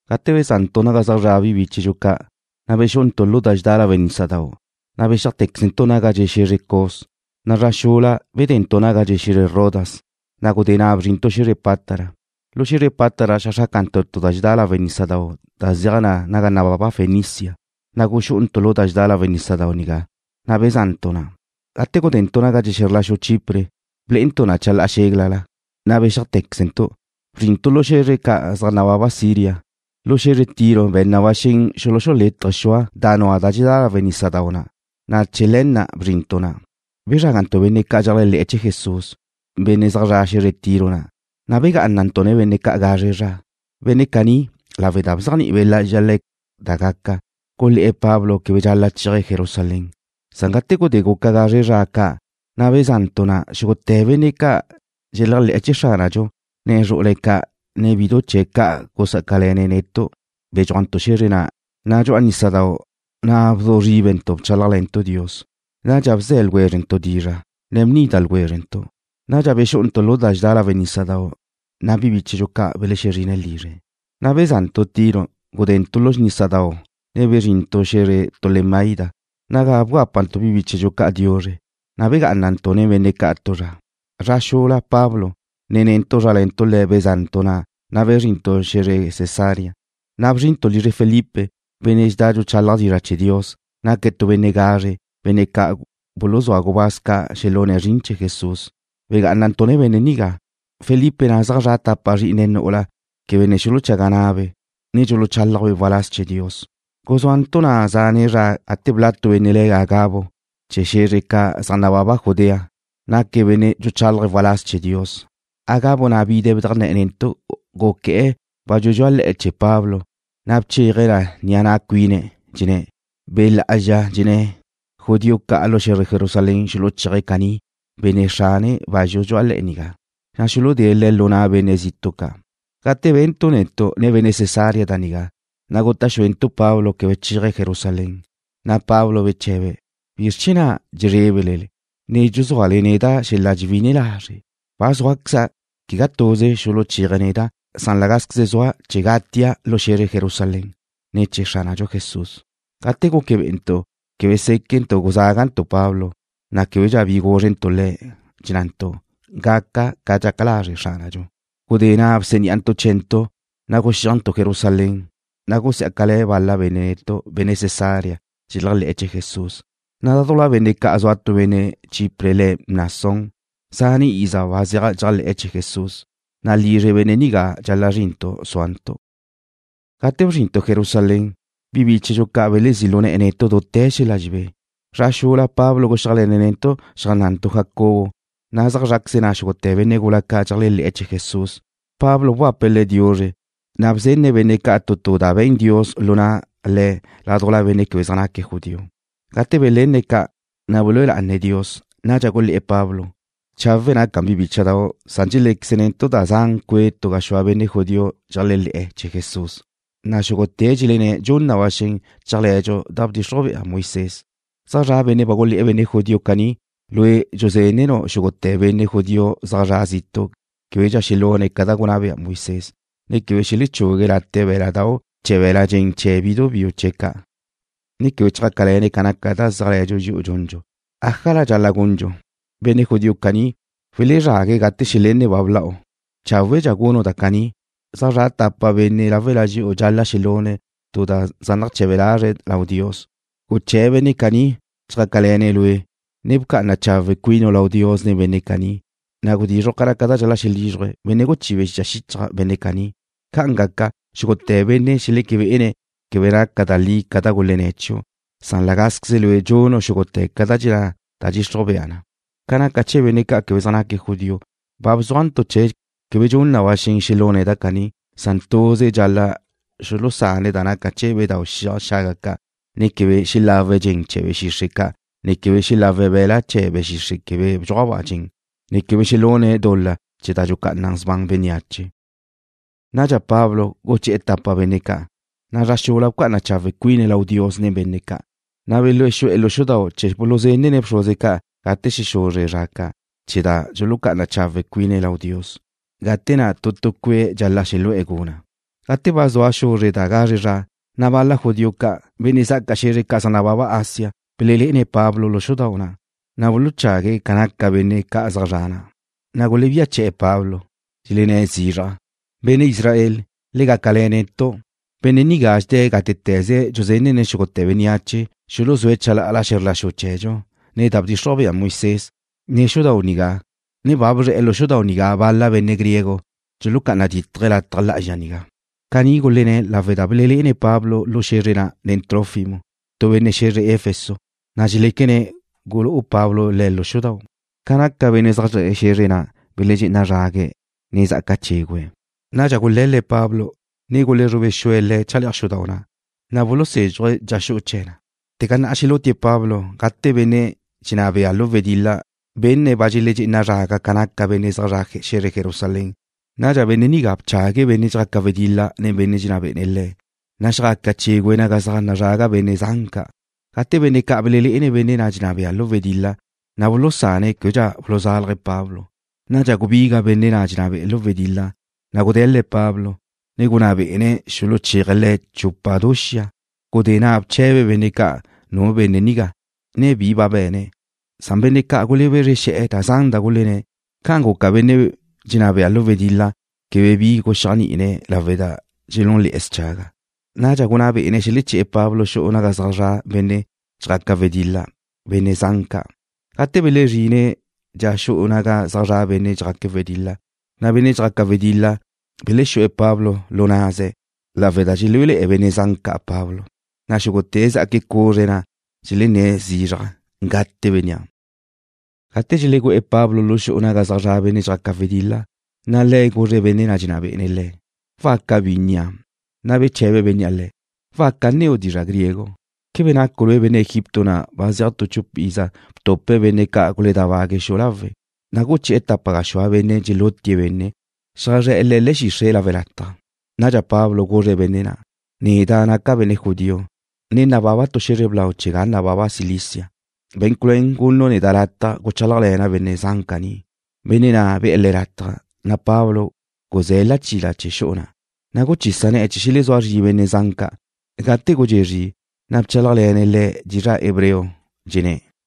Gate beza'ntu' naga zaj zra' bi bíchedxu ca', na' bexú'untu' lu da dxedá lawe' nísadau', na' bexíajteczentu' naga dxe' xe̱zre Cos, na' zra xula gudentu' naga dxe' xe̱zre Rodas, na' gudé na' bzrintu' xe̱zre Pátara. Lu xe̱zre Pátara xeajxrácantu' tu da dxedá lawe' nísadau' da zeaj na naga nababa Fenicia. Na' guxu'untu' lu da dxedá lawe' nísadau' nigá, na' beza'ntu' na'. Gate gudentu' naga dxe' xe̱zr la xu Chipre, blé'entu' na chalá'a xéglala, na' bexíajteczentu', bzrintu' lu xe̱zre ca' zaj nababa Siria. Lu xe̱zre Tiro be̱n na ba xen xuluxulétaje̱' xua' da nua da dxedá lawe' nísadau' na', na' chee̱ le̱ na' bzrintu' na'. Na' bezrágantu' benne' ca' dxeléajle̱'e̱ chee̱ Jesús, benne' zaj zre̱'e̱ xe̱zre Tiro na', na' begá'anantu' nen benne' ca' gazre zra. Benne' caní, lawe' da bzéajni'i Be' Lá'azxa le̱' da gaca, gulé̱'e̱ Pablo quebe dxal-la' chéaje̱' Jerusalén. Gate gudé guca gazre zra ca', na' zua xeza'ntu' na'. Xúgute̱ benne' ca' dxeléajle'e̱ chee̱ Xránadxu, ne zru'ule̱' ca', ne bidu chee̱' ca' gusá'acale̱ne̱' netu' bedxúajte̱ntu' xe̱zre na', na' dxu'a nísadau' na' bzu zríbentu' bchálajle̱ntu' Dios. Nadxa bze̱ ljwézrentu' dizra', ne bnídate̱ ljwézrentu'. Nadxa bexú'untu' lu da dxedá lawe' nísadau', na' bi bíchedxu ca' belexezrine̱' lizre̱'. Beza'ntu' Tiro, gudentu' lu nísadau', ne bzrínte̱ntu' xe̱zre Tolemaida, naga bgápantu' bi bíchedxu ca' diuzre, ne begá'anantu' nen benne' ca' tu zra. Zra xula Pablo, ne netu' zrále̱ntu' le̱' bezá'ntu' na', na' bzrintu' xe̱zre Cesarea. Na' bzrintu' lizre Felipe, benne' dxedá dxuchálaje̱' dizra' chee̱ Dios. Naque̱' tu benne' gazre, benne' ca' buluzúa gubáz ca' xelune̱' zrin chee̱ Jesús. Begá'anantu' nen benne' nigá. Felipe na' zaj zra' tapa zrí'ine̱' nu'ula quebe ne xuluchaga na'abe', ne dxuluchálajbe' waláz chee̱ Dios. Guzúantu' na' zane' zra gate bla' tu benne' le̱' Agabo chee̱ xe̱zre ca' zaj nababa Judea. Naque̱' benne' dxuchálaje̱' waláz chee̱ Dios. Agabo na' bide̱' bedajnné̱'e̱ netu'. Guqué̱'e̱ bazxu dxu'a le̱'e̱ chee̱ Pablo, na' bchéaje̱' na ni'a na' cuine̱', dxenné̱': ―Be' Lá'azxa dxenné̱' judío ca' lu xe̱zre Jerusalén xuluchéaj caní benne' xrane bazxu dxu'a le̱'e̱ nigá, na' xuludée̱' le̱' lu na' benne' zitu' ca'. Gate bentu' netu', ne benne' Cesarea da nigá, na' guta' xuentu' Pablo quebe chéaje̱' Jerusalén. Pablo beche̱be̱': ―¿Bizr chee̱ na' dxebézrele, ne dxuzúale neda' xel-la' dxewí'ine lazre'? Ba zúaqueza', quegá tuze xuluchéaje̱' neda', san la gázqueze zua' chee̱ gatia' lu xe̱zre Jerusalén ne̱ chee̱ Xránadxu Jesús. Gate guque bé'entu' quebe séquentu' guzágantu' Pablo, na' québedxa bi gúzrentu' le̱', dxennantu': ―Gaca ca dxaca lazre' Xránadxu. Gudé na' bsení'antu' chee̱ntu', na' guxíajntu' Jerusalén. Na' gusiá'acale̱ bal-la benne' netu', benne' Cesarea dxeléajle̱'e̱ chee̱ Jesús, na' ládujla benne' ca' zua tu benne' Chipre le̱' Mnasón, zane' iza ba zeaj dxéajle̱'e̱ chee̱ Jesús, na' lizre benne' nigá dxal-la' zrintu' súantu'. Gate bzrintu' Jerusalén, bi bíchedxu ca' belezí' lu ne̱'e̱ netu' dute̱ xel-la' dxelebé. Zra xula Pablo guxíajle̱ne̱' netu' xeajnná'ntu' Jacobo, na' zaj zrá'queze na' xúgute̱ benne' gula ca' dxeléajle̱'e̱ chee̱ Jesús. Pablo bgape̱' le̱' diuzre, na' bzenne̱' benne' ca' tu tu da be̱n Dios lu na' le̱' ládujla benne' quebe zaj naque̱' judío. Gate belenne̱' ca', na' belúe lá'ane̱' Dios. Nadxa gulé̱'e̱ Pablo: ―Chawe' naca na, bi bícha'dau'. Dxelé'equezenu' zane gaxúa benne' judío dxeléajle̱'e̱ chee̱ Jesús, na' xúgute̱' dxelenné̱' dxun na ba xen chéajle̱dxu da bdxixruj bea Moisés. Zaj zra' benne' ba gulé̱'e̱ benne' judío caní lue' dxusé̱denu' xúgute̱ benne' judío zaj zre̱'e̱ zitu' québedxa xelune̱' ca da gunná be'e Moisés, ne quebe xelechugue̱' late' bé̱la'dau' chee̱ be̱l-la' dxen chee̱ bidu biu chee̱' ca', ne quebe chjácale̱ne̱' ca naca da zéajle̱dxu dxi'u dxundxu. ¿Ájala dxal-la' gundxu? Benne' judío caní welezrague̱' gate xelenne̱' ba bla'u. Cháwedxa gunu' da caní: Zaj zra' tapa benne' láwela dxi'u dxal-la' xelune̱' tu da zaj nache̱be lazre̱' lau Dios. Guché̱ benne' caní chjá'acale̱ne̱' lue', ne bca'ana chawe' cuinu' lau Dios nen benne' caní, na' gudizruj ca naca da dxal-la' xelízruje̱' benne' guchibe̱' xicha xichaj benne' caní. Ca'an gaca, xúgute̱ benne' xeleque bé'ene̱' quebe naca da li ca da gulenné̱' chiu', san la gázqueze lue' dxunu' xúgute̱ ca da dxenná da nadxixruj bea na. Ca naca chee̱ benne' ca' quebe zaj naque̱' judío, ba bzúajntu' chee̱' quebe dxun na ba xen xelune̱' da caní, san tuze dxal-la' xulusane̱' da naca chee̱ bedáu' xiaj xaga ca', ne quebe xelawe̱' dxen chee̱ be̱ xixre' ca', ne quebe xelawe̱' be̱la' chee̱ be̱ xixre', be̱ quebe bdxuaj dxen, ne quebe xelune̱' dul-la chee̱ da dxucá'ana sban bénneache. Nadxa Pablo guché̱'e̱ tapa benne' ca', na' zra xula bca'ana chawe' cuine̱' lau Dios nen benne' ca', na' belexú'e̱ lu xudau' chee̱ buluzenne̱' bxruze ca' gate xexuzre zra ca' chee̱ da dxulucá'ana chawe' cuine̱' lau Dios, gate na' tu tue̱' dxal-la' xelegú'e̱ guna'. Gate ba zua xuzre da gazre zra, na' bal-la judío ca', benne' zá'aca xe̱zre ca' zaj nababa Asia, belelé'ene̱' Pablo lu xudau' na', na' buluchague̱' ca naca benne' ca' zaj zre̱'e̱ na', na' gulebía che̱'e̱ Pablo. Dxelenné̱' zizraj: ―Benne' Israel, le gácale̱ netu'. Benne' nigá dxedé̱' gátete̱ze dxusé̱dene̱' xúgute̱ bénneache xuluzúe̱' chalá'ala xe̱zr la xu chee̱dxu, ne da bdxixruj be'e Moisés, ne xudau' nigá, ne ba guzre̱'e̱ lu xudau' nigá bal-la benne' griego. Dxucá'ana dítaje̱' lataj lá'azxa nigá. Caní gulenné̱' lawe' da ba belelé'ene̱' Pablo lu xe̱zre na' nen Trófimo, tu benne' xe̱zre Efeso, na' dxeléquene̱' gulú'u Pablo le̱' lu xudau'. Ca naca benne' zaj zre̱'e̱ xe̱zre na' beledxé'ena zrague̱', ne zá'aca chégüe̱'. Nadxa gule̱l-le̱' Pablo, ne gulezrube xue̱' le̱' chale'aj xudau' na', na' bulusézxuje̱' dxa xu'u chee̱ na. Ba zuate̱ xelútie̱' Pablo gate benne' Roma dxenná be'e̱ lu wedil-la benne̱' ba dxeledxé'ena zraga ca naca benne' zaj zre̱'e̱ xe̱zre Jerusalén. Nadxa benne' nigá bchague̱' benne' dxjaque̱' wedil-la nen benne' dxenná bé'ene̱' le̱', na' xjaca chégüe̱' naga zaj nazraga benne' zan ca'. Gate benne' ca' belelé'ene̱' benne' na' dxenná be'e̱ lu wedil-la, na' bulusane̱' québedxa buluzálaje̱' Pablo. Nadxa gubiga' benne' na' dxenná be'e̱ lu wedil-la, na' gude̱l-le̱' Pablo, ne gunná bé'ene̱' xuluchéaje̱' le̱' chupa du xia. Gudé na' bche̱be̱' benne' ca' nua' benne' nigá, ne bi ba be̱ne̱'. Benne' ca' gulebezre xe̱'e̱ da zan da gulenné̱'. Ca'an guca benne' dxenná be'e̱ lu wedil-la quebe bi guxéajni'ine̱' lawe' da dxelúnle̱'e̱ schaga'. Nadxa gunná bé'ene̱' xeleché̱'e̱ Pablo xu'u naga zaj zra' benne' dxjaque̱' wedil-la, benne' zan ca'. Gate belezrine̱' dxa xu'u naga zaj zra' benne' dxjaque̱' wedil-la, na' benne' dxjaque̱' wedil-la belexú'e̱ Pablo lu na'ze̱' lawe' da dxelúele̱'e̱ benne' zan ca' Pablo, na' xúgute̱' zá'aque̱' cuzre na' dxelenné̱' zizraj: ―Gate bénnea'. Gate dxelegú'e̱ Pablo lu xu'u naga zaj zra' benne' dxjaque̱' wedil-la, le̱' guzre̱' benne' na' dxenná bé'ene̱' le̱': ―¿Waca bi nnia'? Na' bche̱be bénnea' le̱': ―¿Waca nneu' dizra' griego? ¿Quebe nacu' lue' benne' Egipto na' ba zeaj tu chupa iza btupe̱' benne' ca' guledábague̱' xu'u lawe', na' guché̱'e̱ tapa gaxúa benne' dxelutie̱' benne', xeajzré̱'e̱ le̱' le̱'e̱ xixre' lawe' lataj? Nadxa Pablo guzre̱' benne' na': ―Neda' naca' benne' judío, ne nababa' tu xe̱zre blau chee̱ ga nababa Cilicia. Be̱n culuén gunu' neda' lataj guchálajle̱na' benne' zan caní. Benne' na' be̱'e̱ le̱' lataj, na' Pablo guzé̱' lachila chee̱ xu'u na', na' guchisa ne̱'e̱ chee̱ xelezúa zri benne' zan ca'. Gate gudxé' zri, na' bchálajle̱ne̱' le̱' dizra' hebreo, dxenné̱':